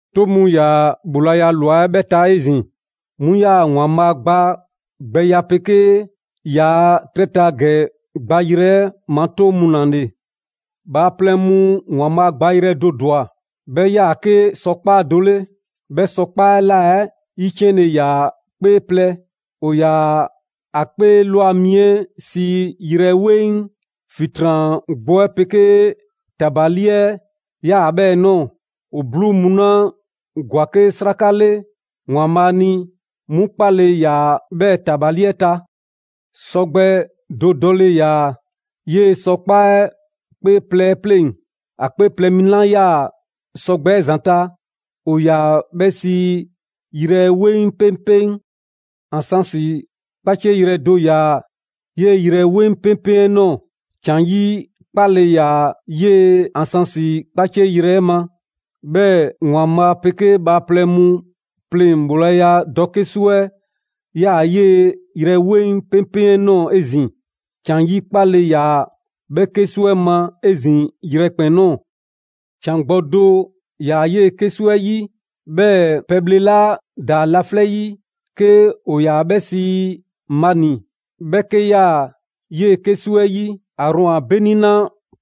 'Toŋ mu ‑yaa ‑bhoolaya ‑lwa 'ɛ 'bhɛ ta 'ezin‑, 'mu 'yaa‑ ‑Waanbhaa' gba gbɛya 'pegee ‑yaa' 'trɛ ta ‑gɛ gbayrɛ 'ɛ ma 'toŋ mu ‑la ‑le. Bhaaplɛŋ mu ‑Waanbhaa' gbayrɛ do ‑dwa, 'bhɛ 'yaa‑ 'ke sɔkpaa' do 'le. 'Bhɛ sɔkpaa' 'ɛ ꞊la 'ɛ 'yiciɛnle ‑yaa 'kpee plɛ: ‑o ‑yaa ‑a 'kpee ‑lwa mi 'ɛ sii yrɛ 'weŋ. ‑Fitran gbɔ 'ɛ 'pegee ‑tabali 'ɛ 'yaa‑ 'bhɛɛ ‑ ꞊nɔɔ. ‑O 'bluu mu 'la ‑gwa 'ke 'sraka 'le ‑Waanbhaa' ni, 'mu 'kpaale‑ ‑yaa' 'bhɛɛ‑ ‑tabali 'ɛ ta. Sɔgbɛ do dɔle ‑yaa 'yee‑ sɔkpaa' 'ɛ 'kpee plɛ 'ɛ 'pleŋ‑. ‑A 'kpee plɛ mi 'la 'yaa‑ sɔgbɛ 'ɛ ‑zanta', ‑o ‑yaa 'bhɛ sii yrɛ 'weŋ 'peŋpeŋ. Ansansi 'kpacieyrɛ do ‑yaa 'yee‑ yrɛ 'weŋ 'peŋpeŋ 'ɛ ꞊nɔɔ. ‑Can 'yi 'kpale‑ ‑yaa 'yee ansansi 'kpacieyrɛ 'ɛ ma. 'Bhɛɛ‑ ‑Waanbhaa' 'pegee bhaaplɛŋ mu pleŋ‑ ‑bhoolaya dɔ 'kesu 'ɛ 'yaa‑ 'yee‑ yrɛ 'weŋ 'peŋpeŋ 'ɛ ꞊nɔɔ 'ezin‑. ‑Can 'yi 'kpale‑ ‑yaa 'bhɛ 'kesu 'ɛ ma 'ezin‑ yrɛkpɛn‑ ꞊nɔɔ. ‑Can gbɔ do ‑yaa 'yee‑ 'kesu 'ɛ 'yi; 'bhɛɛ‑ pɛbhle 'la ꞊daa laflɛ' 'yi, 'ke ‑o ‑yaa 'bhɛ sii mani, 'bhɛ 'ke 'yaa‑ 'yee‑ 'kesu 'ɛ 'yi. Aarɔn a 'beni 'la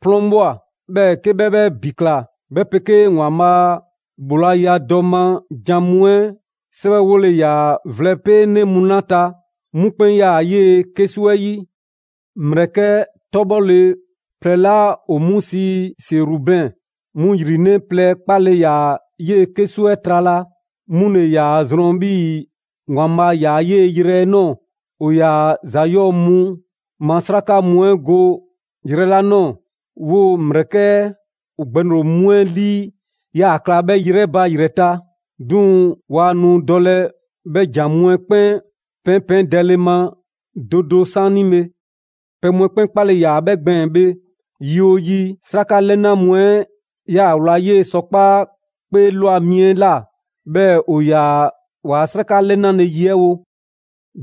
'plɔn ꞊bhwa, 'bhɛɛ‑ 'ke 'bhɛ 'bhɛ ‑bi ꞊kla, 'bhɛ 'pegee ‑Waanbhaa' a ‑bhoolaya dɔ ma ‑jan mu 'ɛ 'sɛwɛwole ‑yaa vlɛ 'peenɛ mu 'la 'ta, 'mu 'kpɛn 'yaa‑ 'yee‑ 'kesu 'ɛ 'yi. ‑Mlɛkɛ' 'tɔbhɔle plɛ 'la ‑o 'mu sii Serubɛn, 'mu ‑yrinɛ' plɛ 'kpale‑ ‑yaa 'yee‑ 'kesu 'ɛ trala, 'mu ‑le ‑yaa ‑a zrɔn 'bhii‑ ‑Waanbhaa' ‑yaa 'yee‑ yrɛ 'ɛ ꞊nɔɔ. ‑O ‑yaa ‑za 'yɔɔ‑ mu ma 'sraka mu 'ɛ go 'yrɛ 'la ꞊nɔɔ, 'woo‑ ‑mlɛkɛ' 'ɛ ‑o gbɛŋroŋ‑ mu 'ɛ lii ‑yaa kla 'bhɛ yrɛ ba ‑yrɛ ta. 'Duŋ‑ 'waa nu dɔlɛ 'bhɛ ‑jan mu 'ɛ 'kpɛn 'pɛɛnpɛɛndɛlɛ ma do do 'saanibhe. Pɛ mu 'ɛ 'kpɛn 'kpale‑ ‑yaa 'bhɛ gbɛɛn‑ bhe; yi 'oo yi, 'sraka 'lɛna mu 'ɛ 'yaa‑ wla 'yee‑ sɔkpaa' 'kpee ꞊lwa mi 'ɛ ꞊la, 'bhɛɛ‑ ‑o ‑yaa waa 'sraka 'lɛnale ye 'ɛ wo.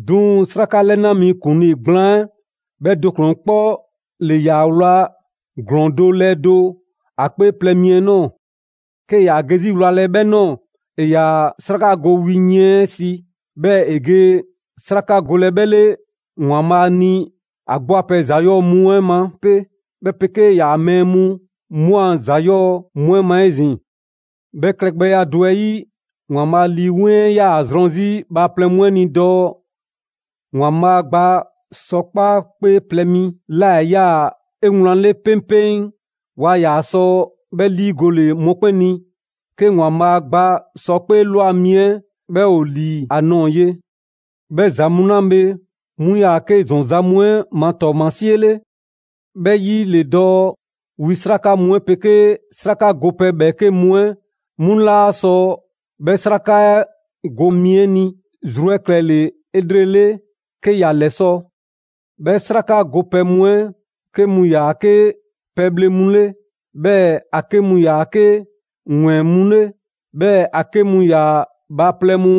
'Duŋ‑ 'sraka 'lɛna mi ‑kuŋlii gblaan 'ɛ 'bhɛ do ‑kplɛn 'kpɔ ‑le ‑yaa wla ‑glɔɔn do lɛɛ do ‑a 'kpee plɛ mi 'ɛ ꞊nɔɔ. 'Kee‑ ‑yaa ge 'zi wlalɛ 'bhɛ ꞊nɔɔ, ‑e ‑yaa 'sraka go wi yiɛn 'ɛ si, 'bhɛɛ‑ ‑e ge 'sraka golɛ 'bhɛ 'le ‑Waanbhaa' ni ‑a 'gbu a pɛ ‑za 'yɔɔ‑ mu 'ɛ ma 'pe, 'bhɛ 'pegee ‑yaa' mɛɛ mu 'mu a ‑za ‑yɔɔ' mu 'ɛ ma 'ezin‑. 'Bhɛ klɛgbɛya do 'ɛ 'yi, ‑Waanbhaa' Lii 'Weŋ 'ɛ 'yaa‑ zrɔn 'zi bhaaplɛŋ mu ni dɔɔ ‑Waanbhaa' gba sɔkpaa' 'ɛ 'kpee plɛ mi 'la 'yaa‑ 'eweŋle 'peŋpeŋ waa ‑yaa sɔ 'bhɛ 'liigole mɔkpɛn' ni, 'ke ‑Waanbhaa' gba sɔkpaa' ꞊lwa mi 'ɛ 'bhɛ ‑o ‑li ‑a nɔɔ‑ ye. 'Bhɛ ‑za mu 'la bhe, 'mu ‑yaa 'ke ‑zɔn za mu 'ɛ ma ‑tɔɔmasie 'le. 'Bhɛ 'yi ‑le dɔɔ wi 'sraka mu 'ɛ 'pegee 'sraka gopɛ ‑bhɛɛke' mu 'ɛ, 'mu laa sɔ 'bhɛ 'sraka 'ɛ go mi 'ɛ zru 'ɛ klɛle‑ 'elrele 'ke ‑ya ‑lɛsɔ'. 'Bhɛ 'sraka gopɛ mu 'ɛ 'ke mu 'yaa‑ 'ke pɛbhle mu 'le, 'bhɛɛ‑ ‑a 'ke mu ‑yaa 'ke ‑wɛɛn mu 'le; 'bhɛɛ‑ ‑a 'ke mu ‑yaa bhaaplɛŋ mu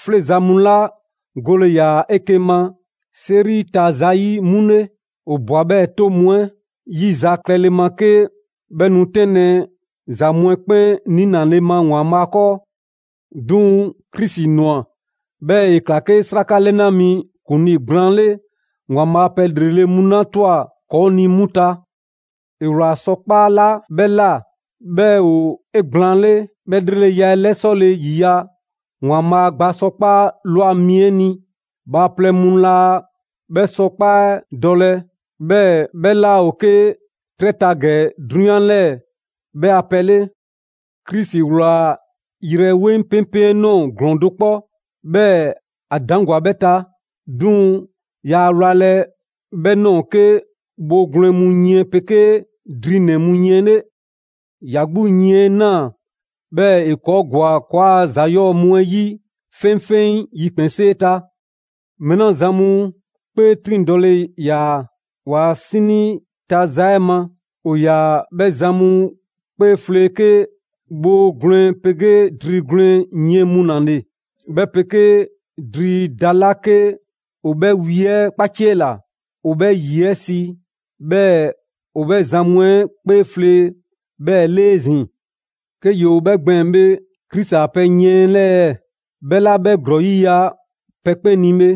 'fleeza‑ mu 'la gole ‑yaa 'eke‑ ma 'seri ta za 'yi 'mu 'le. ‑O ꞊bwa 'bhɛɛ‑ 'toŋ mu 'ɛ 'yi za klɛle ma 'ke 'bhɛ nu 'tɛnlɛ‑ ‑za mu 'ɛ 'kpɛn 'niinale ma ‑Waanbhaa' 'kɔɔ. 'Duŋ‑ Krisi ꞊nwa, 'bhɛɛ‑ ‑e ꞊kla 'ke 'sraka 'lɛna mi ‑kuŋlii gblaan 'le ‑Waanbhaa' pɛ ‑lrele' mu 'la ꞊twa ‑kɔɔ' ni 'mu ta. ‑E ꞊wlaa sɔkpaa' 'la 'bhɛ ꞊la, 'bhɛ ‑o 'egblaanle, 'bhɛ 'lreleya 'ɛ ‑lɛsɔle ‑yiya' ‑Waanbhaa' gba sɔkpaa' ꞊lwa mi 'ɛ ni. Bhaaplɛŋ mu laa 'bhɛ sɔkpaa' 'ɛ dɔlɛ, 'bhɛɛ‑ 'bhɛ 'laa ‑o 'ke 'trɛ ta ‑gɛ 'drunyan 'lɛɛ‑ 'bhɛ a pɛ 'le. Krisi ꞊wlaa yrɛ 'weŋ 'peŋpeŋ 'ɛ ꞊nɔɔ ‑glɔɔn do 'kpɔ, 'bhɛɛ‑ ‑a ‑daŋgwa 'bhɛ ta. 'Duŋ‑ yaa wlalɛ 'bhɛ ꞊nɔɔ 'ke bhoo gwlɛn mu yiɛn 'pegee drinɛ‑ mu yiɛn 'le. ‑Ya 'gbu yiɛn 'ɛ ꞊naa, 'bhɛɛ‑ ‑e ‑kɔɔ' ‑gwa ‑kɔɔa' ‑za 'yɔɔ‑ mu 'ɛ 'yi 'feŋfeŋ yikpɛnsee ta. Mɛɛ 'la zan mu 'kpee 'triŋdɔle ‑yaa ‑waa' 'sinii ta za 'ɛ ma, ‑o ‑yaa 'bhɛ zan mu 'kpee 'flee 'ke bhoo gwlɛn 'pegee dri gwlɛn yiɛn mu ‑la le, 'bhɛ 'pegee dri da 'la 'ke ‑o 'bhɛ wi 'ɛ 'kpaciela ‑o 'bhɛ ‑yie 'ɛ si, 'bhɛɛ‑ ‑o 'bhɛ zan mu 'kpee flee 'bhɛɛ‑ 'le 'ezin‑. 'Ke ‑yoo 'bhɛ gbɛɛn‑ bhe, Krisi a pɛ yiɛn 'ɛ 'lɛɛ‑? 'Bhɛ 'la 'bhɛ ‑glɔɔya' 'yiya‑ pɛ 'kpɛn ni bhe.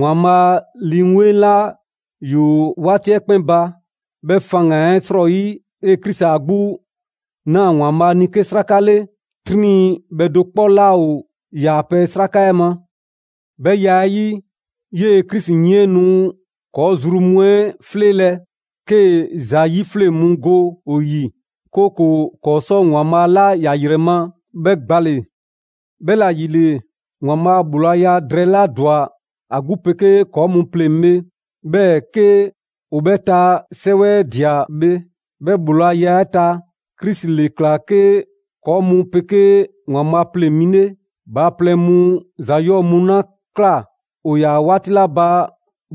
‑Waanbhaa' Lii 'Weŋ 'la ‑yoo 'waati 'ɛ 'kpɛn ba, 'bhɛ faŋgan‑ 'ɛ 'srɔyi, 'yee‑ Krisi 'a 'gbu ꞊naa ‑Waanbhaa' ni 'ke 'sraka 'le, 'triŋ bhɛ do 'kpɔ 'laa ‑o ‑yaa pɛ 'sraka 'ɛ ma. 'Bhɛ ya 'ɛ 'yi, 'yee‑ Krisi yiɛn 'ɛ nu ‑kɔɔ' zru mu 'ɛ 'fleelɛ‑ 'kee‑ ‑za 'yifleŋ mu go ‑o 'yi; 'kooko‑ ‑kɔɔ' sɔ ‑Waanbhaa' 'la ‑ya ‑yrɛ ma 'bhɛ gbale‑. 'Bhɛla ‑yile, ‑Waanbhaa' ‑bhoolaya drɛɛ 'la ‑dwa ‑a 'gbu 'pegee ‑kɔɔ' mu pleŋ‑ bhe, 'bhɛɛ‑ 'ke ‑o bhɛ ta 'sɛwɛdia bhe, 'bhɛ ‑bhoolaya 'ɛ ta, Krisi ‑le ‑kla 'ke ‑kɔɔ' mu 'pegee ‑Waanbhaa' pleŋ‑ mi 'le. Bhaaplɛŋ mu ‑za 'yɔɔ‑ mu 'la ꞊kla ‑o ‑yaa 'waati 'la ba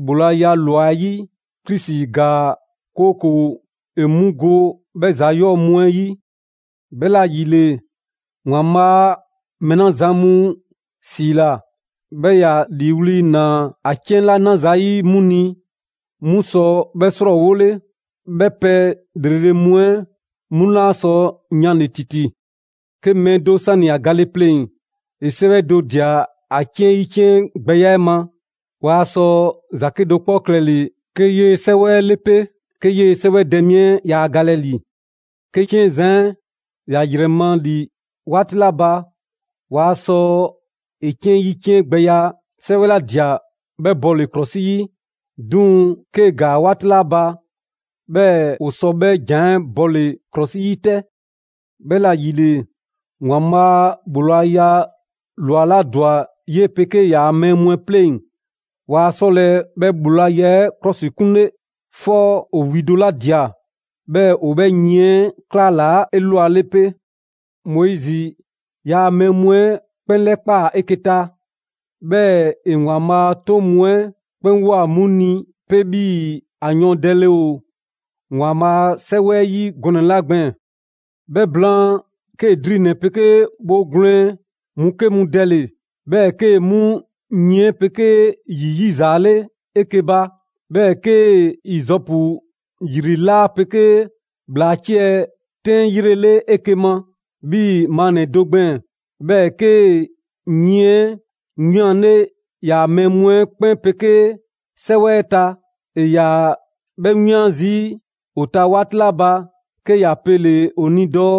‑bhoolaya ꞊lwa 'ɛ 'yi, Krisi ‑gaa 'kooko‑ ‑e 'mu go 'bhɛ ‑za 'yɔɔ‑ mu 'ɛ 'yi. 'Bhɛla‑ ‑yile, ‑Waanbhaa' mɛɛ 'la zan mu ‑siila, 'bhɛɛ‑ ‑ya ‑liiwli' ꞊naa ‑a 'ciɛn 'la 'na zayi' 'mu ni, 'mu sɔ 'bhɛ 'srɔɔwole; 'bhɛ pɛ ‑lrele' mu 'ɛ 'mu 'laa sɔ yanle‑ ‑titi. 'Ke mɛɛ do 'sani‑ ‑a gale pleŋ‑, ‑e 'sɛwɛ do ꞊dia ‑a 'ciɛn 'yiciɛngbɛya 'ɛ ma, waa sɔ ‑za 'kedo‑ 'kpɔ klɛle‑ 'ke 'yee‑ 'sɛwɛ 'ɛ 'le 'pe, 'ke 'yee‑ 'sɛwɛdɛ mi 'ɛ yaa galɛ ‑li. 'Ke 'ciɛn zan 'ɛ ‑ya ‑yrɛ ma ‑li 'waati 'la ba, ‑waa sɔ ‑e 'ciɛn 'yiciɛngbɛya 'sɛwɛ ‑la ꞊dia 'bhɛ bɔle‑ ‑klɔsi 'yi. 'Duŋ‑, 'kee‑ ‑gaa 'waati 'la ba, 'bhɛɛ‑ ‑o sɔ 'bhɛ ‑jan 'ɛ bɔle‑ ‑klɔsi 'yi 'tɛ. 'Bhɛla‑ ‑yile, ‑Waanbhaa' ‑bhoolaya ꞊lwa 'la ‑dwa 'yee‑ 'pegee ‑yaa' mɛɛ mu 'ɛ 'pleŋ‑, waa 'sɔlɛ‑ 'bhɛ ‑bhoolaya 'ɛ 'klɔsikunle, 'fɔ ‑o wi do ‑la ꞊dia 'bhɛɛ‑ ‑o 'bhɛ 'yiɛn 'ɛ ‑klalaa' 'elwale 'pe. Moizi ‑yaa' mɛɛ mu 'ɛ 'kpɛn 'lɛkpaa‑ 'eke‑ ta, 'bhɛɛ‑ ‑e ‑Waanbhaa' a 'toŋ mu 'ɛ 'kpɛn ꞊woa 'mu ni 'pe 'bhii‑ ‑a yɔɔndɛle ‑o ‑Waanbhaa' a 'Sɛwɛ 'ɛ 'yi gɔnɛ‑ 'la gbɛɛn‑. 'Bhɛ blaan, 'kee‑ drinɛ‑ 'pegee bhoo gwlɛn mu 'ke mu dɛle‑; 'bhɛɛ‑ 'kee‑ 'mu yiɛn 'ɛ 'pegee ‑yi 'yizaale 'eke‑ ba. 'Bhɛɛ‑ 'kee‑ Izɔpu ‑yri 'laa 'pegee ‑bhlaa 'ciɛ‑ 'tɛn 'yrele 'eke‑ ma 'bhii‑ ‑maannɛ do gbɛɛn‑; 'bhɛɛ‑ 'kee‑ yiɛn 'ɛ 'wianle ‑yaa' mɛɛ mu 'ɛ 'kpɛn 'pegee 'sɛwɛ 'ɛ ta. ‑E ‑yaa 'bhɛ 'wian zii' ‑o ta 'waati 'la ba, 'ke ‑ya pele‑ ‑o ni dɔɔ: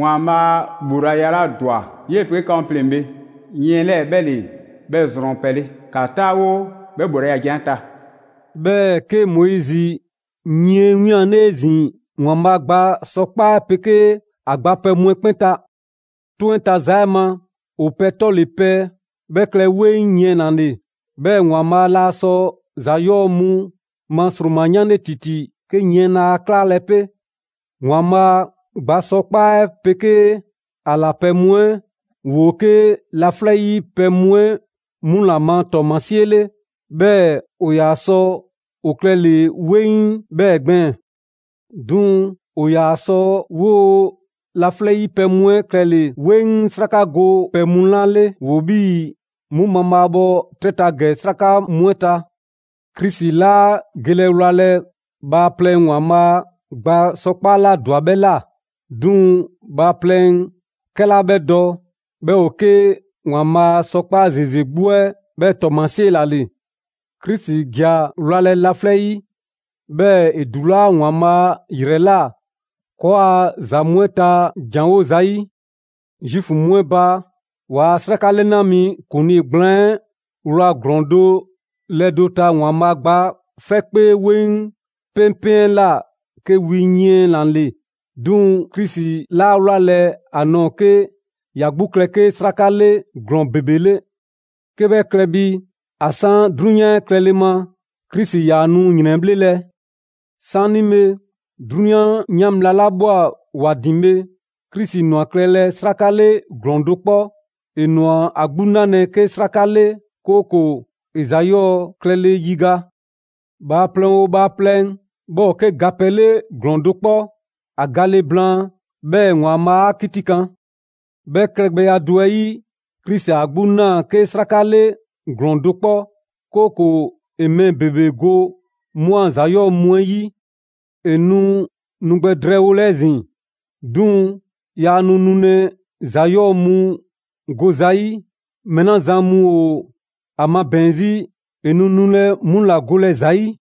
«‑Waanbhaa' ‑bhoolaya 'la ‑dwa 'yee‑ 'pegee 'ka mu pleŋ‑ bhe, yiɛn 'lɛɛ‑ 'bhɛ ‑le 'bhɛ zrɔn pɛ 'le. ‑Ka 'taawo 'bhɛɛ‑ ‑bhoolaya ‑jan 'ɛ ta.» 'Bhɛɛ‑, 'ke Moizi yiɛn ‑wianle' 'ezin‑ ‑Waanbhaa' gba sɔkpaa' 'ɛ 'pegee ‑a gba pɛ mu 'ɛ 'kpɛn ta. 'Toŋ 'ɛ ta za 'ɛ ma, ‑o pɛ 'tɔle‑ pɛ 'bhɛ klɛ 'weŋ yiɛn ‑la ‑le. 'Bhɛɛ‑ ‑Waanbhaa' laa sɔ ‑za 'yɔɔ‑ mu ma ‑sroma 'yanle ‑titi 'ke yiɛn 'laa 'klaalɛ‑ 'pe. ‑Waanbhaa' gba sɔkpaa' 'ɛ 'pegee ‑a ꞊la pɛ mu 'ɛ ‑woo 'ke laflɛ' 'yi pɛ mu 'ɛ 'mu ‑la ma ‑tɔɔmasie 'le, 'bhɛɛ‑ ‑o ‑yaa sɔ ‑o klɛle‑ 'weŋ 'bhɛɛ‑ gbɛɛn‑. 'Duŋ‑ ‑o ‑yaa sɔ 'woo‑ laflɛ' 'yi pɛ mu 'ɛ klɛle‑ 'weŋ 'sraka go mu 'la 'le ‑yoo 'bhii‑ 'mu mabhaabhɔ 'trɛ ta ‑gɛ 'sraka mu 'ɛ ta. Krisi 'laa gelɛ wlalɛ bhaaplɛŋ ‑Waanbhaa' gba sɔkpaa' 'la ‑dwa 'bhɛ ꞊la. 'Duŋ‑ bhaaplɛŋ 'kɛla 'bhɛ dɔ, 'bhɛ ‑o 'ke ‑Waanbhaa' sɔkpaa' ‑zeze 'gbu 'ɛ 'bhɛɛ‑ ‑tɔɔmasie ‑la ‑le. Krisi ‑ja wlalɛ laflɛ' 'yi, 'bhɛɛ‑ ‑e ‑dulaa' ‑Waanbhaa' ‑yrɛ ꞊la, ‑kɔɔa' ‑za mu 'ɛ ta janwo zayi'. Zuufu mu 'ɛ ba, ‑waa' 'sraka 'lɛna mi ‑kuŋlii gblaan 'ɛ wla ‑glɔɔn do ‑lɛɛ do ta ‑Waanbhaa' gba 'fɛ 'kpee 'weŋ 'peŋpeŋ 'ɛ ꞊la 'ke wi yiɛn ‑la ‑le. 'Duŋ‑ Krisi 'laa wlalɛ ‑a nɔɔ‑ 'ke ‑ya 'gbu klɛ 'ke 'sraka 'le ‑glɔɔn ‑bebe 'le. 'Ke 'bhɛ klɛ bi, ‑a 'san 'drunyan klɛle ma, Krisi ‑yaa nu ‑yrɛnbhlelɛ. 'Saanibhe 'drunyan 'yan bhla 'la ꞊bhwa ‑wa ‑din bhe, Krisi ꞊nwa klɛlɛ 'sraka 'le ‑glɔɔn do 'kpɔ. ‑E ‑nwa ‑a 'gbu 'nalɛ‑ 'ke 'sraka 'le, 'kooko‑ ‑e ‑za 'yɔɔ‑ klɛle ‑yiga'. Bhaaplɛŋ 'oo bhaaplɛŋ, 'bhɛ ‑o 'ke ga pɛ 'le ‑glɔɔn do 'kpɔ. ‑A gale blaan, 'bhɛɛ‑ ‑Waanbhaa' 'a 'kitikan. 'Bhɛ klɛgbɛya do 'ɛ 'yi, Krisi 'a 'gbu ꞊naa 'ke 'sraka 'le ‑glɔɔn do 'kpɔ, 'kooko‑ ‑e mɛɛ ‑bebe go 'mu ‑a ‑za 'yɔɔ‑ mu 'ɛ 'yi. ‑E nu nu gbɛ drɛɛwolɛ 'ezin‑, 'duŋ‑ yaa nu nulɛ ‑za 'yɔɔ‑ mu go zayi'; mɛɛ 'la zan mu ‑o ‑a magbɛn 'zi, ‑e nu nulɛ 'mu ‑la golɛ zayi' ‑za 'yi.